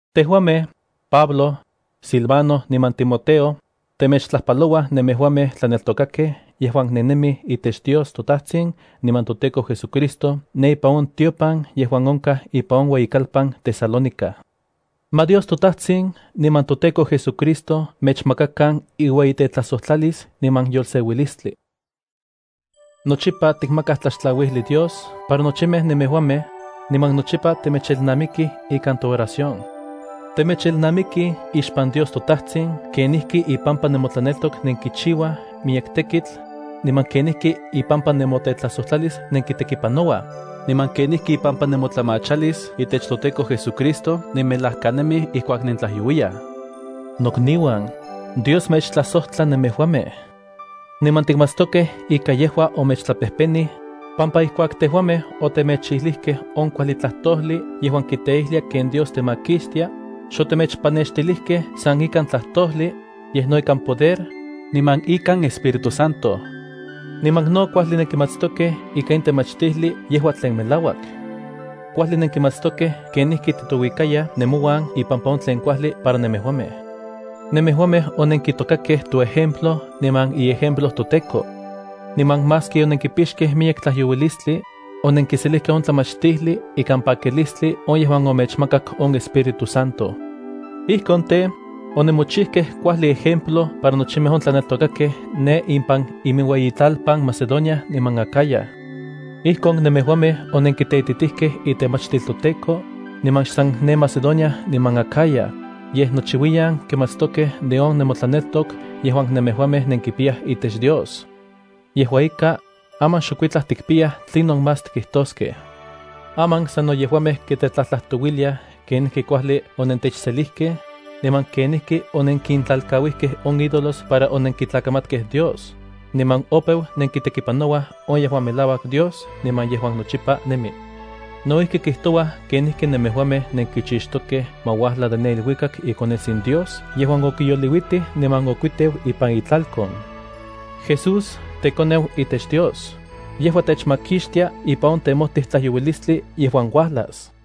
Tejuamej, Pablo, Silvano niman Timoteo, temechtlajpalouaj nemejuamej tlaneltokakej yejuan nennemij itech Dios toTajtsin niman toTEKO JesuCristo ne ipan on tiopan yejuan onkaj ipan on ueyikalpan Tesalónica. Ma Dios toTajtsin niman toTEKO JesuCristo mechmakakan iueyitetlajsojtlalis niman yolseuilistli. Nochipa tikmakaj tlaxtlauijli Dios para nochimej nemejuamej, niman nochipa temechelnamikij ikan tooración. Temechelnamikij ixpan Dios toTajtsin kenijki ipampa nemotlaneltok nenkichiuaj miyek tekitl, niman kenijki ipampa nemotetlajsojtlalis nenkitekipanouaj, niman kenijki ipampa nemotlamachalis itech toTEKO JesuCristo nenmelajkanemij ijkuak nentlajyouiyaj. Nokniuan, Dios mechtlajsojtla nemejuamej. Niman tikmatstokej ika yejua omechtlapejpenij, pampa ijkuak tejuamej otemechijlijkej on kuajli tlajtojli yejuan kiteijlia ken Dios temakixtia, xotemechpanextilijkej san ikan tlajtojli, yej no ikan poder, niman ikan Espíritu Santo. Niman no kuajli nenkimatstokej ika in temachtijli yejua tlen melauak. Kuajli nenkimatstokej kenijki titouikayaj nemouan ipampa on tlen kuajli para nemejuamej. Nemejuamej onenkitokakej toejemplo niman iejemplo toTEKO. Niman maski onenkipixkej miyek tlajyouilistli, onenkiselijkej on tlamachtijli ikan pakilistli on yejuan omechmakak on Espíritu Santo. Ijkon tej, onemochijkej kuajli ejemplo para nochimej on tlaneltokakej ne impan iminueyitlalpan Macedonia niman Acaya. Ijkon nemejuamej onenkiteititijkej itemachtil toTEKO, niman xsan ne Macedonia niman Acaya, yej nochiuiyan kimatstokej de on nemotlaneltok yejuan nemejuamej nenkipiyaj itech Dios. Yejua ika, aman xokuitlaj tikpiyaj tlinon más tikijtoskej. Aman sano yejuamej kitetlajtlajtouiliaj kenijki kuajli onentechselijkej, niman kenijki onenkintlalkauijkej on ídolos para onenkitlakamatkej Dios, niman opeu nenkitekipanouaj on yejuan melauak Dios niman yejuan nochipa nemi. No ijki kijtouaj kenijki nemejuamej nenkichixtokej ma uajla de ne iluikak iKonetsin Dios yejuan okiyoliuitij niman okuiteu ipan itlalkon. Jesús, teKoneu itech Dios, yejua techmakixtia ipan on temojtij tlajyouilistli yejuan uajlas.